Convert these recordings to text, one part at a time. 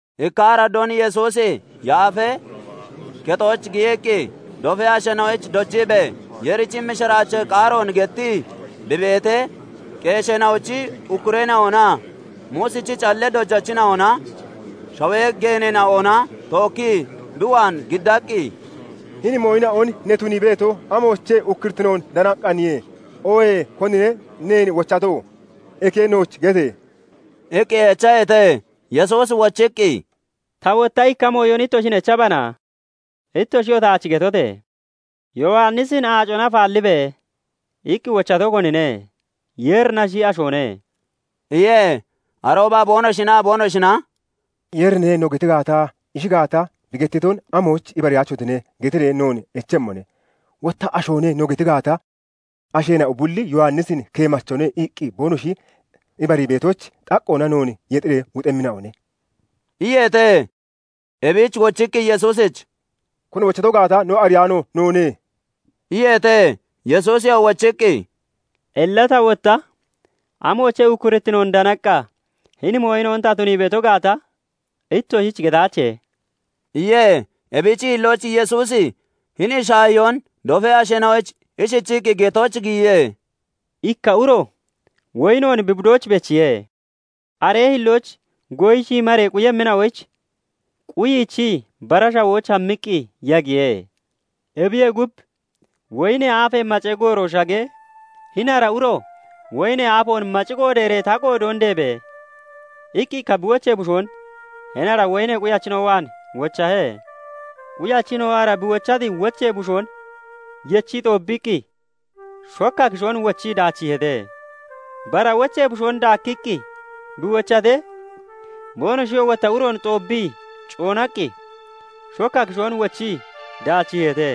Ikka araddoon Yesuusi Yaafee Kexooch giyiqqi dofee asheena'oyich dojiibee Yeerichi mishiraachee qaaroon gettii bi beetee, qeesheena'ochi ukkureena'onaa Muusichi callee dojachina'ona shawee geeneena'ona tookkii bi waan giddaqqi, "Hini mooyina'on ne tunii beeto, amoochee ukkurittinoon danaqqaaniye? Oohee konine neen wochato? Eke nooch gete!" iqqi echaheete. Yesuusi wochiqqi "Ta wotta ikka mooyon ittoshin echbana! Ittoshiyoo taach getote! Yowannisin 'Aacona afaallibe!' iqqi wochato konine? Yeerinashi, ashoone?" iye. Arooba boonoshinaa boonoshina " 'Yeerine' no geti gaata, 'Ishi gaata, bi gettiton amoyich ibariyaachotine?' getiree noon echemmone; Wotta 'Ashoone' no geti gaata, asheena'o bulli Yowannisin keemachone iqqi boonoshi ibarii beetoyich, xaqqoona noon yexiree wuxemmina'one" iyeete. Ebich wochiqqi Yesuusich, "Koni wochato gaata no ariyaano noone" iyeete. Yesuusiyoo wochiqqi, "Illa tawoo wotta amoochee ukkurittinoon danaqqa hini mooyina'on ta tunii beeto gaata ittoshich getaache" iye. Ebichi hillooch Yesuusi hini shaahiyoon dofee asheena'oyich ishichiqqi getooch giyiye; "Ikka uro woyinoon bi budooch bechiye; aree hillooch goyi shiimaree quyemmina'oyich quyiichii bara shawooch hammiqqi yagiye. "Ebiyee gub, woyinee aafee macee gooroo shagee, hini ara uro 'Woyinee aafoon maci qoodeeree ta qoodoon deebe!' iqqi ikka bi wochee bushoon hini ara quyachina'o waan wochahe. Quyachina'oo ara bi wochati wochee bushoon yechii xoobbiqqi shokka kishoon wochii daachiiheete. "Bara wochee bushoon daakkiqqi bi wochatee, boonoshiyoo wotta aroon xoobbii coonaqqi shokka kishoon wochii daachiiheete.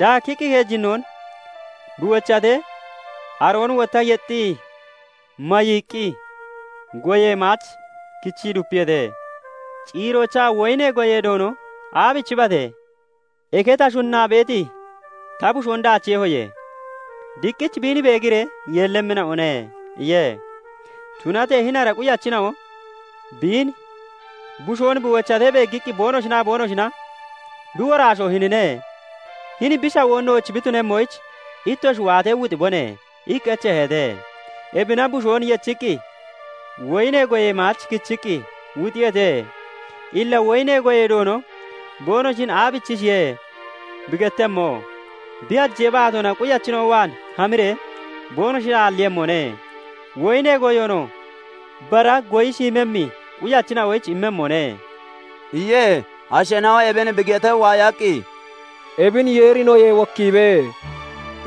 Daakkiqqi keejinnoon bi wochatee, aroon wotta yexxii mayiiqqi goyee maach kichii dupiyeete. "Ciiroochaa woyinee goyee doono 'Aabichibate? Eke ta shunnaa beeti ta bushoon daachiiyehoye; diqqich biin beegiree yeellemmina'one' iye. "Tunatee hini ara quyachina'o bin bushoon bi waatee beeggiqqi boonoshinaa boonoshina 'Bi woraasho hinine; hini bi shawoo nooch bi tunemmoyich ittoshi waatee, wuxibone!' iqqi echeeheete. Ebina bushoon yechiqqi woyinee goyee maach kichiqqi wuxiyeete. "Illa woyinee goyee doono boonoshin aabichishiye bi gettemmo? Bi hajee baatoona quyachina'o waan hamiree boonoshin aalliiyemmone; woyinee goyoonoo bara goyi shiimmemmi quyachina'oyich immemmone" iye. Asheena'o ebin bi getee waayaqqi, "Ebin Yeeri noyee wokkiibe!"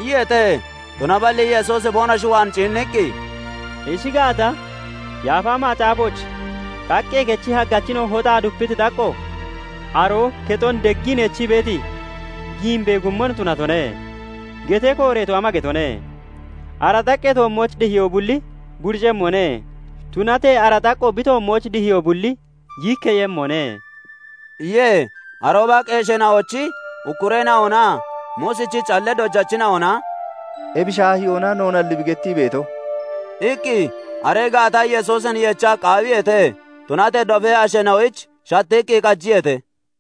iyeete. Tunaballi Yesuusi boonoshi waan ciinniqqi, "Ishi gaata, Yaafa Macaafooch 'Xaqqee kechi haggachina'o hoxaa dupiti xaqqo, aroo kexon deggii neechii beeti giimbee guummon tunatone' getee kooreeto ama getone? Ara xaqqee toommooch dihiyoo bulli buricemmone; tunatee ara xaqqo bi toommooch dihiyoo bulli yiikkeeyemmone" iye. Arooba qeesheena'ochi ukkureena'onaa Muusichi callee dojachina'ona "Ebi shaahiyoona noonalli bi gettii beeto" iqqi, aree gaata Yesuusin yecha qaawiyeete; tunatee dofee asheena'oyich shattiqqi qajiyeete.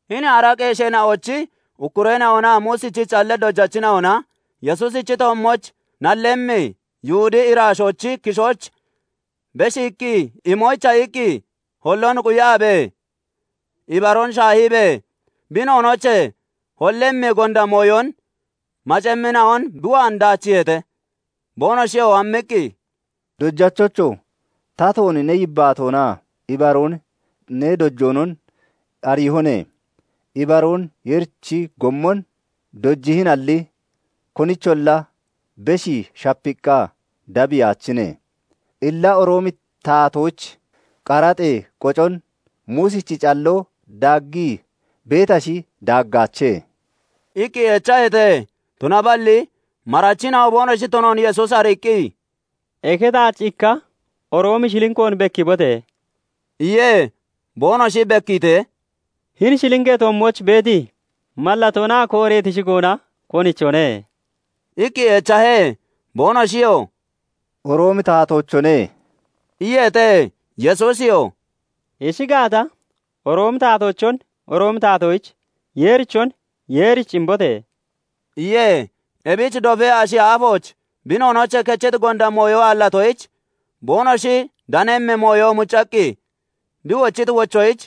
Hini ara qeesheena'ochi ukkureena'onaa Muusichi callee dojachina'ona Yesuusichi toommooch nallemmi Yihudee iraashoochi kishooch beshiiqqi imoyicha iqqi holloon quyabee, ibaroon shaahiibee, bi noonoochee hollimmi gonda mooyon macemmina'on bi waan daachiiheete. Boonoshiyoo hammiqqi, "Dojachocho! Tatoon ne yibbaatoonaa ibaroon ne dojoonon ariihone; ibaroon Yeerichi gommon dojihinalli, konicholla beshii shapiiqqa dabbiyaachine. Illa Roomi taatoyich qaraxee qocon Muusichi calloo daaggii beetashi, daaggaache?" iqqi echaheete. Tunaballi marachina'o boonoshi tunoon Yesuusi ariiqqi, "Eke taach ikka Roomi shilnkoon bekkiibote!" iye. Boonoshi bekkiitee, "Hini shilnkee toommooch beeti mallatoonaa kooreeti shigoona konichone?" iqqi echahe. Boonoshiyoo "Roomi taatoochone" iyeete. Yesuusiyoo "Ishi gaata, Roomi taatoochon Roomi taatoyich, Yeerichon Yeerichi imbote!" iye. Ebich dofee ashi aafooch bi noonoochee kechiti gonda mooyo aallatoyich, boonoshi danemmi mooyon muccaqqi bi wochiti wochoyich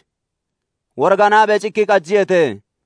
woriganaabee cikkii qajiyeete.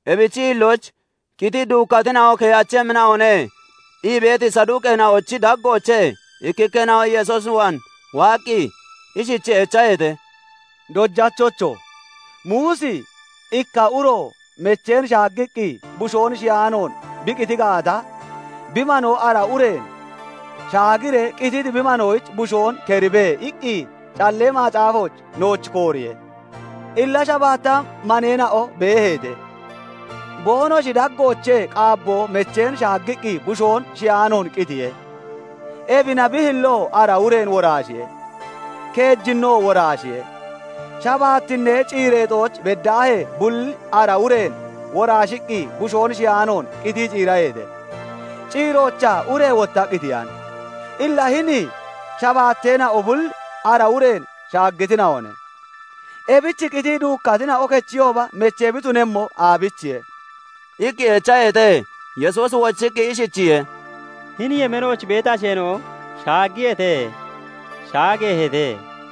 Ebichi hillooch "Qitii duukkatina'o keyaachemmina'one" ii beeti Saduuqeena'ochi daggoochee ikkikkeena'o Yesuus waan waaqqi ishichii echaheete; "Dojachocho! Muusi 'Ikka uro mecheen shaaggiqqi bushoon shiyaanoon bi qiti gaata, bi manoo ara ureen shaagiree qititi bi manoyich bushoon keribe!' iqqi Callee Macaafooch nooch kooriye. Illa shabaatta maneena'o beeheete; boonoshi daggoochee qaabboo mecheen shaaggiqqi bushoon shiyaanoon qitiye. Ebina bi hilloo ara ureen woraashiye; keejinnoo woraashiye; shabaattinnee ciireexooch beddaahee bulli ara ureen woraashiqqi bushoon shiyaanoon qitii ciiraheete. Ciiroochaa ure wotta qitiyane. Illa hini shabaateena'o bulli ara ureen shaaggitina'one. Ebich qitii duukkatina'o kechiyooba mechee bi tunemmo aabichiye?" iqqi echaheete. Yesuusi wochiqqi ishichiye:- "Hini yemeenooch beeti asheena'o shaaggiyeete; shaageeheete.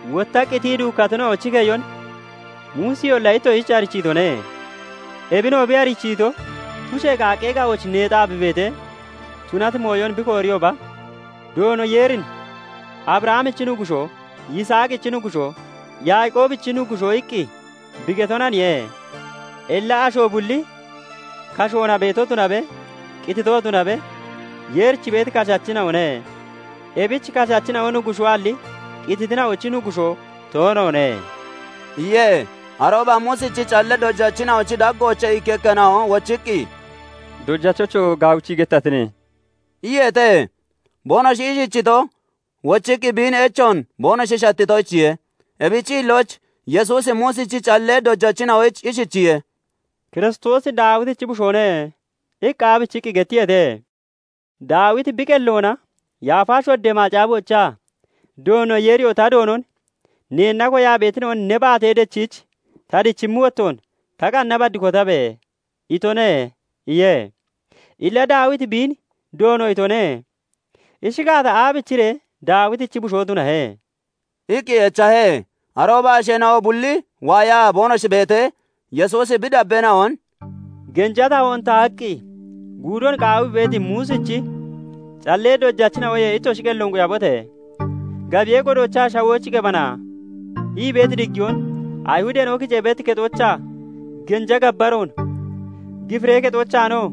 Wotta qitii duukkatina'ochi keyon Muusiyolla ittoshich arichiitone; ebinoo bi arichiito, tushee qaaqqee ga'ooch nexaa bi beetee tunati mooyon bi kooriyooba, Doono Yeerin 'Abrahamichi Nuggushoo, Yisaaqichi Nuggushoo, Yaaqoobichi Nuggushoo' iqqi bi getonaniye. Illa asho bulli kashoona beeto tunabe, qititoo tunabe, Yeerich beeti kashachina'one; ebich kashachina'o Nuggushoalli qititina'ochi Nuggushoo toonoone" iye. Arooba Muusichi callee dojachina'ochi daggoochee ikkikkeena'o wochiqqi, "Dojachocho! Gaawichii gettatine" iyeete. Boonoshi ishichito, wochiqqi biin echoon boonoshi shattitoyichiye. Ebichi hillooch Yesuusi Muusichi callee dojachina'oyich ishichiye:- " 'Kiristoosi Daawitichi bushoone' iqqi aabichii gettiyeete? Daawiti bi qelloona Yaafa Shoddee Macaafoochaa 'Doono Yeeriyoo ta Doonon "Neenna koyaa beetina'on ne baatee dechiich ta dichimmi wottoon ta qanna bad kotabe!" itone' iye. Illa Daawiti biin 'Doono' itone; ishi gaata, aabichiree Daawitichi bushoo tunahe?" iqqi echahe. Arooba asheena'o bulli waayaa boonoshi beetee, Yesuusi bi dabbeena'on "Genja tahoon tahaqqi guudon qaawii beeti Muusichi callee dojachina'oyee ittoshi qelloon quyabote! Gabiyee godoochaa 'Shawooch qebana' ii beeti diggiyoon, Ayihudeena'o kicee beeti kexoochaa genja gabbaroon, gifiree kexoochaanoo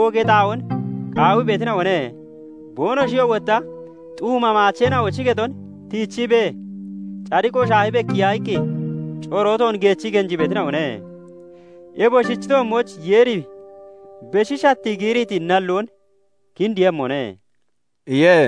oogee xaa'oon qaawii beetina'one. Boonoshiyoo wotta xuuma maacheena'ochi kexon tiichiibee, cadiqo shaahi bekkiya iqqi corootoon geechii genjii beetina'one. Ebosichi toommooch Yeeri beshi shattii giiriiti nalloon kindiiyemmone" iye.